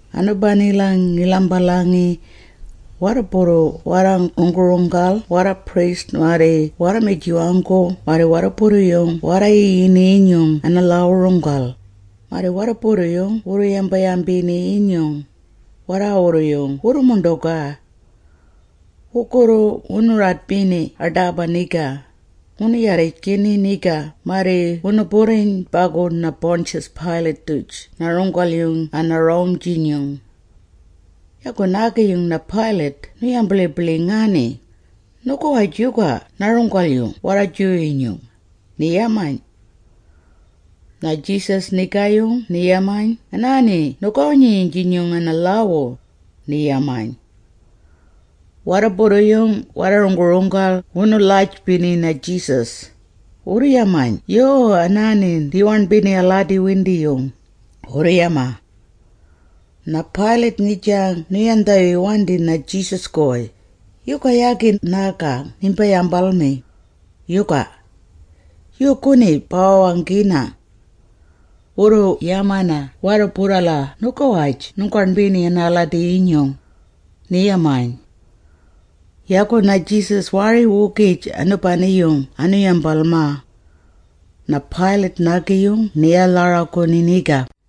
Anubanila ngi-lhalmbalangi. Warruburru warra-runggu-runggal warra-priest marri warra-mijiwanggu marri warruburru-yung warra-yiyini-yinyung ana-lhaawu-runggal, marri warruburru-yung wuu-yamba-yambini-yinyung, warraawurru-yung wurru-muṉḏugaa. Wugurru wunu-radbini aḏaba niga, wunu-yarrijgini niga marri wunu-burriyn bagu na-Pontius Pilate-duj na-runggal-yung ana-Rome-jinyung. Yagu nigaayung na-Pilate nu-yambiḻibiḻingaani, “Nugawaj yuga na-Runggal-yung warra-Jew-yinyung?” ni-yamayn. Na-Jesus nigaayung ni-yamayn “Anaani nugawi-nyinyung ana-lhaawu,” ni-yamayn. Warruburru-yung warra-runggu-runggal wunu-lhajbini na-Jesus, wurru-yamayn “Yuu, anaani ni-waṉbini aladi-windiyung,” wurru-yamaa. Na-Pilate ngijang nu-yandhawiwandi na-Jesus-guy, “Yuga yagi nagang nimbi-yambalmi, yuga? Yuuguni ba-wawanggina. Wurru-yamana warruburrala nugawaj nunggaṉbini anaaladi-windiyung,” ni-yamaa. Yagu na-Jesus waari-wugij anubani-yung anu-yambalmaa. Na-Pilate naagi-yung ni-walharaguni niga.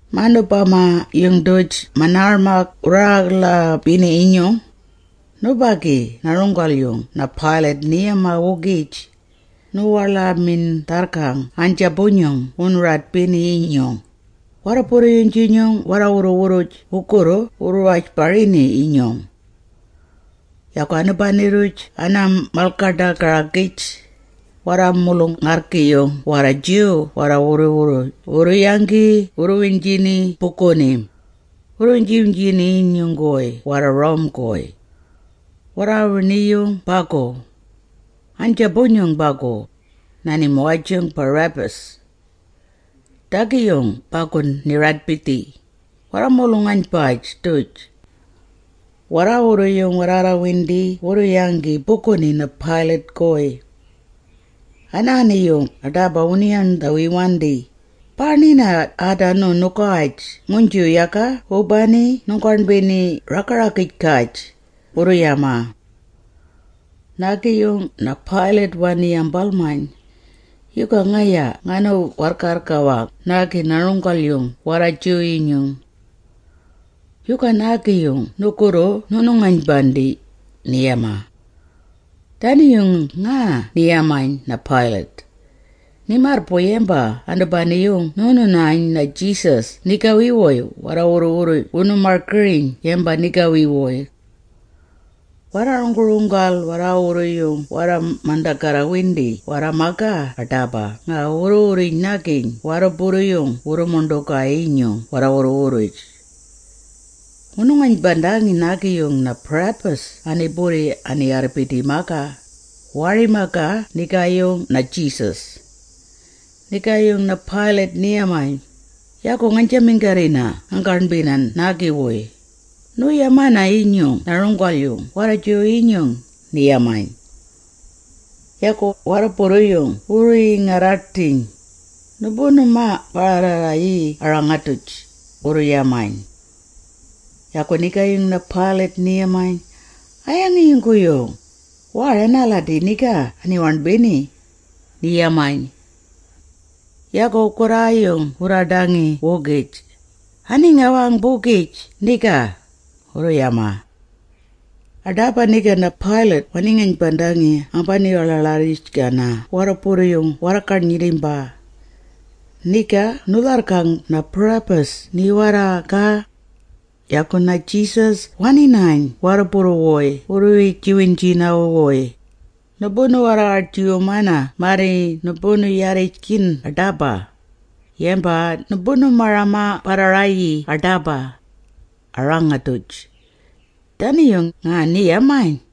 Manubama-yung-duj manaarmag wu-rangga-ḻaabini-yinyung, nubagi na-runggal-yung na-Pilate ni-yamaa-wugij, nu-waḻamin-dharrgang naaynjaabu-nyung wunu-radbini-yinyung, warruburru-yung-jinyung warra-wurru-wurruj wugurru wurru-wajbarini-yinyung. Yagu anubani-rruj ana-mal-ḏaga-ragij-gaj, warra-mulung-arrgi-yung warra-Jew warraawurru-yung wurru-yanggi wurru-wiynjini buguni, wurru-wiynji-wiynjini-wuy warra-Roman-guy. Warra-wini bagu. Naaynjaabu-nyung bagu, na-nimuwaj-jung Barabbas. Naadagi-yung bagu ni-radbidhii, warra-mulung-aynbaj-duj. Warraawurru-yung warraarraarrawindi wurru-yanggi buguni na-Pilate-guy. Anaani-yung aḏaba wunu-yandhawawandi, “Baaṉbina aadanu nugawaj nguynju yaga wubani nunggaṉbini a-raga-ragij-gaj,” wurru-yamaa. Nigaayung na-Pilate wani-yambalmayn, “Yuga ngaya nganu-warrgarrga-wang naagi na-Runggal-yung warra-Jew-yinyung? Yuga naagi-yung nugurru nuunu-ngaynbandiyn?” ni-yamaa. Dani-yung nga ni-yamayn na-Pilate, ni-marrbuy yamba anubani-yung wunu-yayn na-Jesus nigawi-wuy warraawurru-yung wunu-margiriyn yamba nigawi-wuy. Warra-runggu-runggal warraawurru-yung warra-mandagarrawindi warra-magaa aḏaba nga wurru-wurrij-nagiyn warruburru-yung wurru-muṉḏugaa-yinyung warra-wurru-wurruj. Wunu-ngaynbandangi naagi-yung na-Barabbas ani-burri ani-warrbidi-maa, waari-magaa nigaayung na-Jesus. Nigaayung na-Pilate ni-yamayn, “Yagu ngaynjaminggarrina nganggaṉbina naagi-wuy, nuunu-mayana-yinyung ‘na-Runggal-yung warra-Jew-yinyung’?” ni-yamayn. Yagu warruburru-yung wurru-yingarraḏdhiyn, “Numbunu-marang-barra-rayii a-rangag-duj!” wurru-yamayn. Yagu nigaayung na-Pilate ni-yamayn, “A-yangi-yungguyung? Waari anaaladi niga ani-waṉbini!” ni-yamayn. Yagu wugurraayung wurraaḏangi-wugij, “Ani-ngawang-bugij niga!” wurru-yamaa. Aḏaba niga na-Pilate wani-ngaynbandangi ambani-waḻaaḻarrijgana warruburru-yung warra-garnyirrimba. Niga nu-lharrgang na-Barabbas ni-warrgarrga, yagu na-Jesus wani-yayn warruburru-wuy wurru-wiynji-wiynjini-wuy, “Numbunaarra-waḏjiwumana marri numbunu-yarrijgiyn aḏaba, bagu numbunu-marang-barra-rayii aḏaba, a-rangag-duj.” Dani-yung nga ni-yamayn.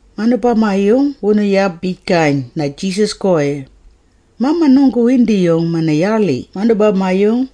Manubama-yung wunu-yabijgayn na-Jesus-guy, mamanunggu-windiyung mana-yaaḻi manubama-yung,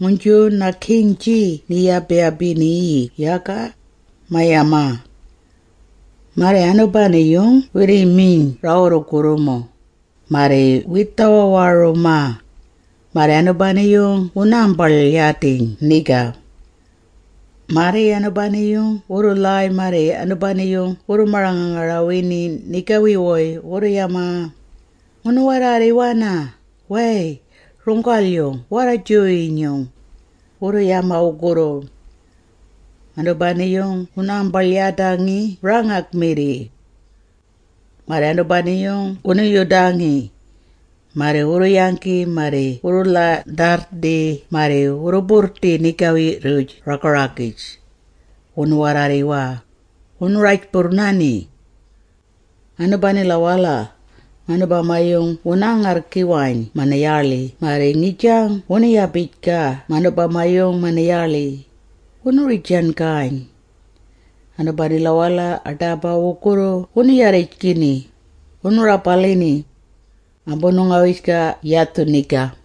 nguynju na-king-jii ni-yaba-yabina-yii yaga, ma-yamaa. Marri anubani-yung wirri-miyn rawurrumugurrumu, marri wirri-dhawawarumaa, marri anubani-yung wunaambaḻ-yadiyn niga. Marri anubani-yung wurru-lhaay marri anubani-yung wurru-marang-ngangarawini nigawi-wuy wurru-yamaa, “Ngunu-warraarriwana! Way! Runggal-yung warra-Jew-yinyung!” wurru-yamaa wugurru. Anubani-yung wunaambaḻ-wadjangi rangag-mirri. Marri anubani-yung wunu-yudangi. Marri wurru-yanggi marri wuu-ḻandharrdhi marri wurru-burrdi nigawi-rruj raga-ragij, wunu-warraarriwaa, wunu-rajburrnani. Anubanila-wala, manubami-yung wunaa-ngarrgiwayn mana-yaaḻi marri ngijang wunu-yabijgayn manubama-yung mana-yaaḻi, wunaa-gaagijgiyn. Anubanila-wala aḏaba, wugurru wunu-yarrijgini, wunu-rabalini, ambunu-ngawijgaa yadhu niga.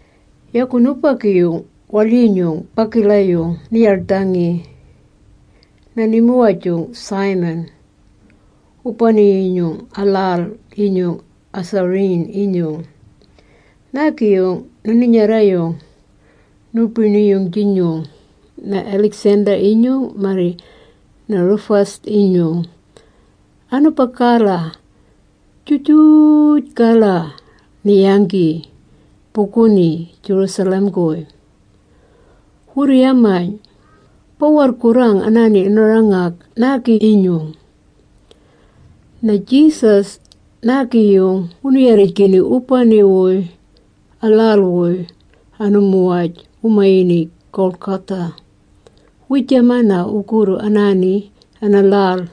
Yagu nubagi-yung waḻyinyung bagala-yung ni-yaḻdhangi, na-nimuwaj-jung Simon, wubani-yinyung a-lhal-inyung a-Cyrene-yinyung. Naagi-yung na-ninyarra-yung nubiṉi-yung-jinyung na-Alexander-yinyung marri na-Rufus-inyung. Anubagala juju…j-gala ni-yanggi, buguni Jerusalem-guy. Wurru-yamayn, “Bawu-warrgurrang aani a-rangag naagi-yinyung.” Na-Jesus naagi-yung wunu-yarrijgini wubani-wuy a-lhal-wuy, anu-muwaj wu-mayini Golgotha. Wiijamana wugurru anaani, ana-lhal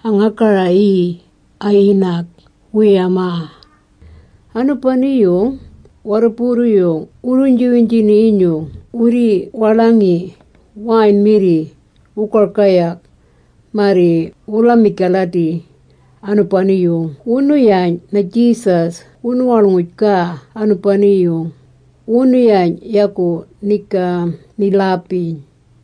a-ngagara-yii ana-yinag, wu-yamaa. Anubani-yung warruburru-yung wurru-wiynji-wiynjini-yinyung wirri-waḻangi wine-mirri, wugargayag, marri wu-ḻamij-galadi, anubani-yung wunu-yayn na-Jesus wunu-waḻ-ngujgaa anubani-yung. Wunu-yayn, yagu niga ni-lhaabiyn.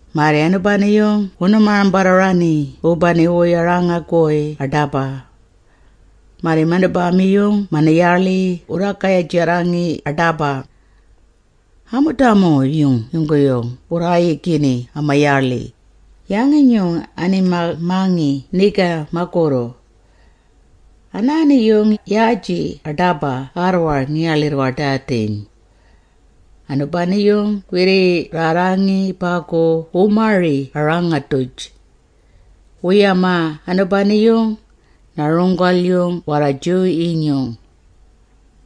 Marri anubani-yung wunu-marang-barra-raani wubani-wuy a-rangag-guy aḏaba. Marri manubama-yung mana-yaaḻi wurraarraayajarrangi aḏaba. Amudama-yung yungguyung wurraayigini ama-yaaḻi, yangi-nyung anima-mangi niga magurru. Anaani-yung yaaji aḏaba arrwar, ngi-waḻirr-wadadiyn. Anubani-yung wirriirrarrangi bagu wu-mari a-rangag-duj. Wu-yamaa anubani-yung, “Na-Runggal-yung warra-Jew-yinyung.”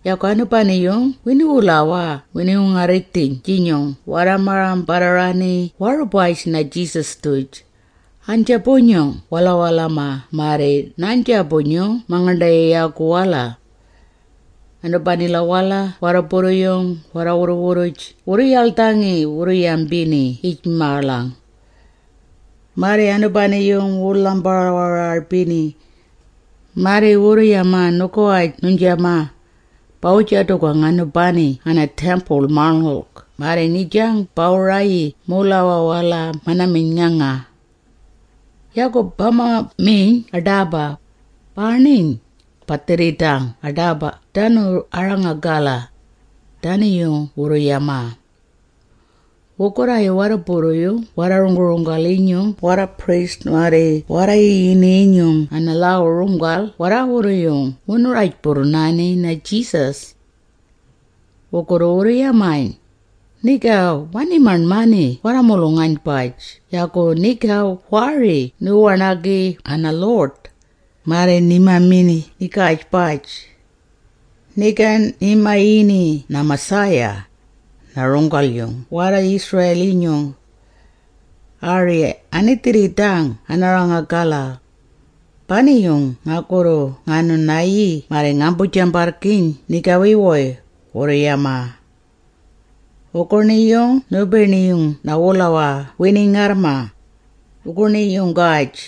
Yagu nubiṉi-yung wini-wulawaa wini-wungarri-dhini-yinyung warra-marang-barra-raani warubaj na-Jesus-duj, aynjaabu-nyung walawalama-wala marri naaynbajung mangaṉḏayayaagu-wala. Anubanila-wala warruburru-yung warra-wurru-wurruj wurru-yaḻdhangi, wuu-yambini yij-maaḻang. Marri anubani-yung wuu-ḻang-barawararbini. Marri wurru-yamaa, “Nugawaj nuynjamaa, bawu-jadugang anubani ana-Temple-Maṉngulg marri ngijang bawu-rayii muulawaa-wala mana-miyn.nganga! Yagu ba-maṉmiiyn aḏaba, baaṉiyn, ba-dhirridang aḏaba aadanu a-rangag-gala!” Dani-yung wurru-yamaa. Wugurraayung warruburru-yung waa-runggu-runggal-inyung warra-priest marri warra-yiyini-yinyung ana-lhaawu-runggal warraawurru-yung wunu-rajburrnani na-Jesus. Wugurru wurru-yamayn, “Niga wani-maṉmangi warra-mulung-aynbaj yagu niga waari ninggu-waṉagang ana-lhuḏ, waari ni-maṉmi nigaaj-baj! Niga ni-mayini na-Messiah, na-runggal-yung warra-Israel-yinyung! Ari ani-dhirridang ana-rangag-gala! Bani-yung ngagurru ngaanu-nayii marri ngaambu-jambarrgiiyn nigawi-wuy!” wurru-yamaa. Wuguṉiiyung nubiṉi-yung na-wulawaa wini-ngarrmaa, wuguṉiiyunggaj.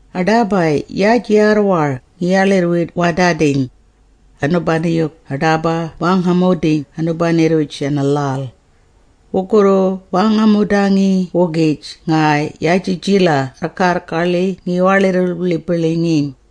Aḏaba yaaji arrwar ngi-waḻirr-wadadiyn, anubani-yung aḏaba waangamudiyn anubani-rruj ana-lhal, wurrugu waangamudangi-wugij nga yaajijila arrgarrgaḻi ngi-waḻirr-wiḻibiḻingiyn.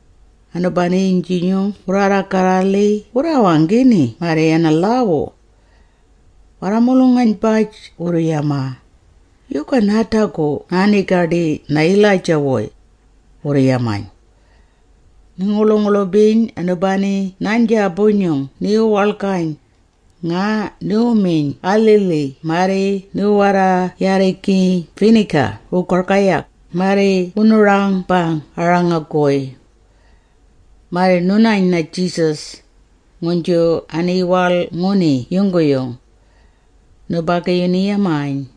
Anubagu-yinyung wurraarra-garra-lhi wurraawanggini anaani ana-lhaawu. Warra-mulung-aynbaj wurru-yamaa, “Yuga naadagu naa-gaḏii na-Elijah-wuy?” wurru-yamayn. Ni-nguḻu-nguḻubiyn nubagi naaynjaabu-nyung ni-wuwaḻgayn, nga ni-miyn alhilhig marri ni-warwarryangi vinegar wugargayag marri niwu-rangag-gabaa a-rangag-guy. Marri nu-yayn na-Jesus, nguynju ani-waḻ-nguni yungguyung. Nubagi-yung ni-yamayn,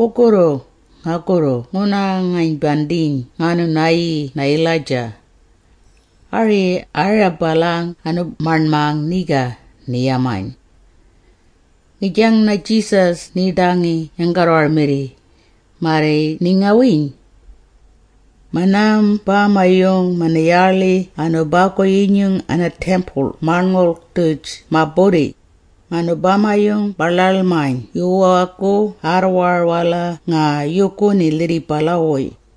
“Wurrugu, ngagurru nguunu-ngaynbandiyn ngaanu-nayii na-Elijah. Ari ani-rabalang anu-maṉmang niga,” ni-yamayn. Ngijang na-Jesus niiḏangi yanggarrwar-mirri, marri ni-ngawiiyn. Manubama-yung mana-yaaḻi anubagu-yinyung ana-Temple-Maṉngulg-duj ma-burri, manubama-yung ma-ḻaḻmayn yuwaagu arrwar-wala nga yuuguni lhirribala-wuy.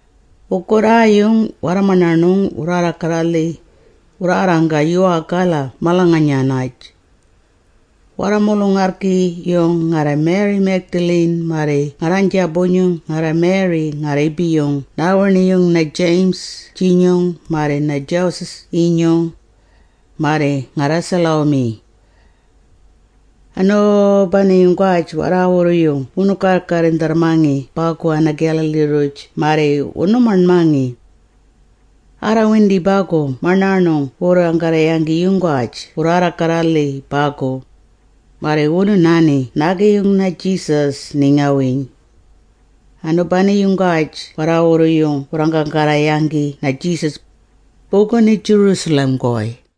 Wugurraayung warra-maṉaṉung wurraarra-garra-lhi, wurraarranggaa yuwaagala malanganyanay. Warra-mulung-arrgi-yung ngarra-Mary Magdalene, marri ngarraaynbajung ngarra-Mary nga-rriibi-yung naawiṉi-yung na-James-inyung marri na-Joses-inyung, marri ngarra-Salome. Anu…bani-yunggaj warraawurru-yung wunu-garrindharrmangi bagu ana-Galilee-rruj marri wunu-maṉmangi. Arraarrawindi bagu maṉaṉung wugurraayunggaj wurraarra-garra-lhi bagu, marri wunu-nani naagi-yung na-Jesus ni-ngawiiyn. Anubani-yunggaj warraawurru-yung wurraanggarra-yanggi na-Jesus, buguni Jerusalem-guy.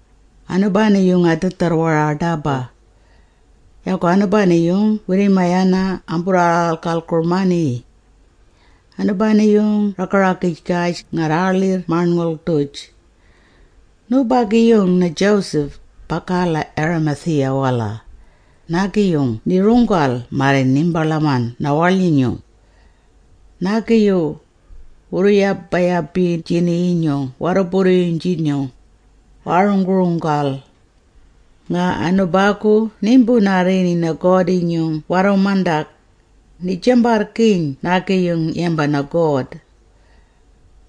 Anubani-yung anaadharrwara aḏaba. Yagu anubani-yung wirri-mayana “amburraarraalgaalgurmani”. Anubani-yung raga-ragij-gaj ngarraaḻirr-maṉngulg-duj. Nubagi-yung na-Joseph, bagala Arimathea-wala, naagi-yung ni-runggal marri niimbaḻaman na-waḻyinyung. Naagi-yung, wurru-yamba-yambiynjini-yinyung warruburru-yung-jinyung, waa-runggu-runggal. Nga anubagu niimbu-narrini na-God-jinyung warru-mandag, ni-jambarrgiiyn naagi-yung yamba na-God.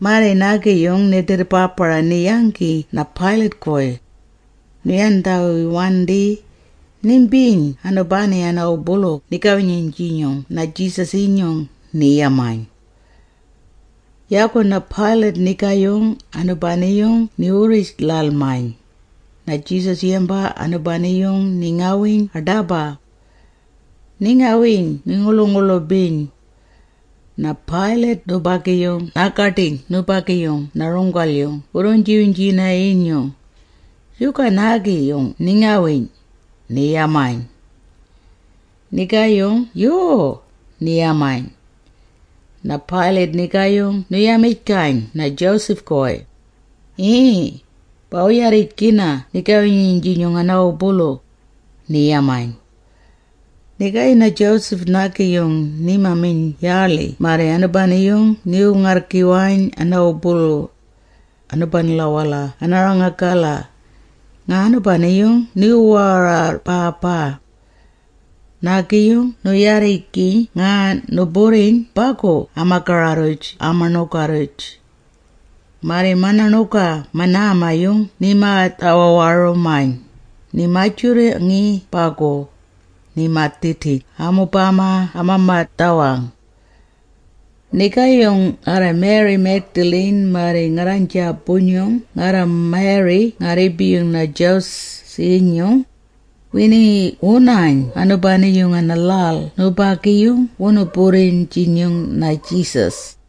Marri naagi-yung ni-ḏirrbaabara, ni-yanggi na-Pilate-guy, nu-yandhawiwandi, “Nimbiiyn anubani ana-wubulu nigawi-nyinyung na-Jesus-jinyung,” ni-yamayn. Yagu na-Pilate nigaayung anubani ni-wurri-ḻaḻmayn, na-Jesus yamba anubani-yung ni-ngawiiyn aḏaba. Ni-ngawiiyn ni-nguḻu-nguḻubiyn. Na-Pilate nubagi naa-gaḏiyn nubagi-yung na-runggal-yung wurru-wiynji-wiynjini-yinyung, “Yuga naagi-yung ni-ngawiiyn?” ni-yamayn. Nigaayung “Yuu,” ni-yamayn. Na-Pilate nigaayung nu-yamijgayn na-Joseph-wuy, “Yii, bawu-yarrijgina nigawi-nyinyung ana-wubulu,” ni-yamayn. Nigaayung na-Joseph naagi-yung nima-miyn yaaḻi marri anubani-yung niwu-ngarrgiwayn ana-wubulu, anubanila ana-rangag-gala, nga anubani-yung niwu-warraabaabaa. Naagi-yung niwu-yurangi nga niwu-burriyn bagu ama-gara-rruj ama-ṉuga-rruj. Marri mana-ṉuga manaama-yung nima-dhawawarumayn, nima-jurangi bagu, nima-dhidiyn amubama ama-madhawang. Nigaayung ngarra-Mary Magdalene, marri ngarraaynbajung ngarra-Mary nga-rriibi-yung na-Joses-inyung, wingiwu-nayn anubani-yung ana-lhal nubagi-yung wunu-burriyn-jinyung na-Jesus.